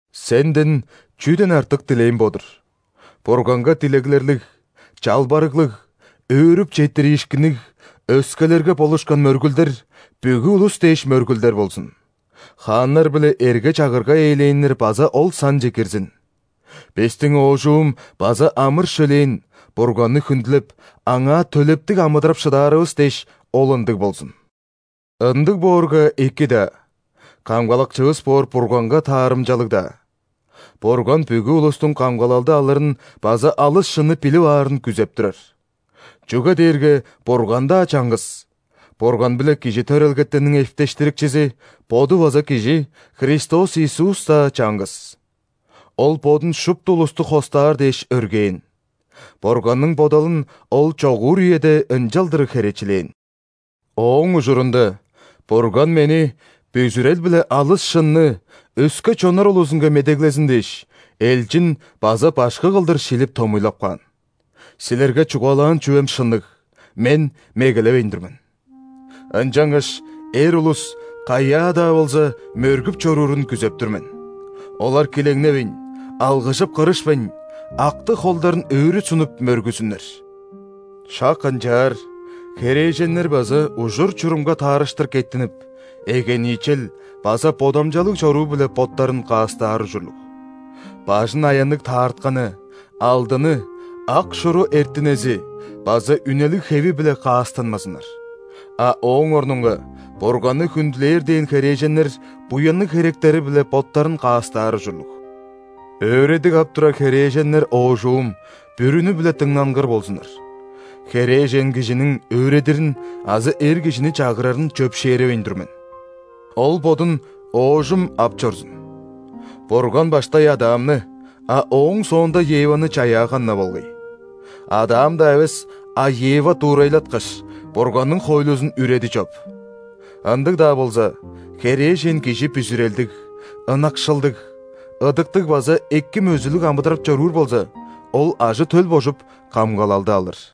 Сенден чүден артык дилээм бо-дур: Бурганга дилеглерлиг, чалбарыглыг, өөрүп четтириишкинниг, өскелерге болушкан мөргүлдер – бүгү улус дээш мөргүлдер болзун. Хааннар биле эрге-чагырга ээлээннер база ол санче кирзин. Бистиң оожум база амыр-шөлээн, Бурганны хүндүлеп, Аңаа төлептиг амыдырап шыдаарывыс дээш, ол ындыг болзун. Ындыг боорга, эки-даа, Камгалакчывыс боор Бурганга таарымчалыг-даа. Бурган бүгү улустуң камгалалды алырын база алыс шынны билип аарын күзеп турар. Чүге дээрге Бурган-даа чаңгыс, Бурган биле кижи төрелгетенниң эптештирикчизи – Боду база кижи – Христос Иисус-даа чаңгыс! Ол Бодун шупту улусту хостаар дээш өргээн. Бурганның бодалын Ол чогуур үеде ынчалдыр херечилээн. Ооң ужурунда Бурган мени бүзүрел биле алыс шынны өске чоннар улузунга медеглезин дээш, элчин база башкы кылдыр шилип томуйлап каан. Силерге чугаалаан чүвем шынныг, мен мегелевейн тур мен! Ынчангаш эр улус каяа-даа болза мөргүп чоруурун күзеп тур мен. Олар килеңневейн, алгыжып-кырышпайн, актыг холдарын өрү сунуп, мөргүзүннер. Шак ынчаар херээженнер база ужур-чурумга таарыштыр кеттинип, эгениичел база бодамчалыг чоруу-биле боттарын каастаар ужурлуг. Бажын аянныг таартканы, алдыны, ак шуру эртинези база үнелиг хеви-биле каастанмазыннар. А ооң орнунга Бурганны хүндүлээр дээн херээженнер буянныг херектери-биле боттарын каастаар ужурлуг. Өөредиг ап турар херээженнер оожум, бүрүнү-биле дыңнангыр болзуннар. Херээжен кижиниң өөредирин азы эр кижини чагырарын чөпшээревейн тур мен. Ол бодун оожум ап чорзун. Бурган баштай Адамны, а ооң соонда Еваны чаяаган-на болгай. Адам-даа эвес, а Ева дуурайлаткаш, Бурганның хоойлузун үреди чоп! Ындыг-даа болза, херээжен кижи бүзүрелдиг, ынакшылдыг, ыдыктыг база эки мөзүлүг амыдырап чоруур болза, ол ажы-төл божуп, камгалалды алыр.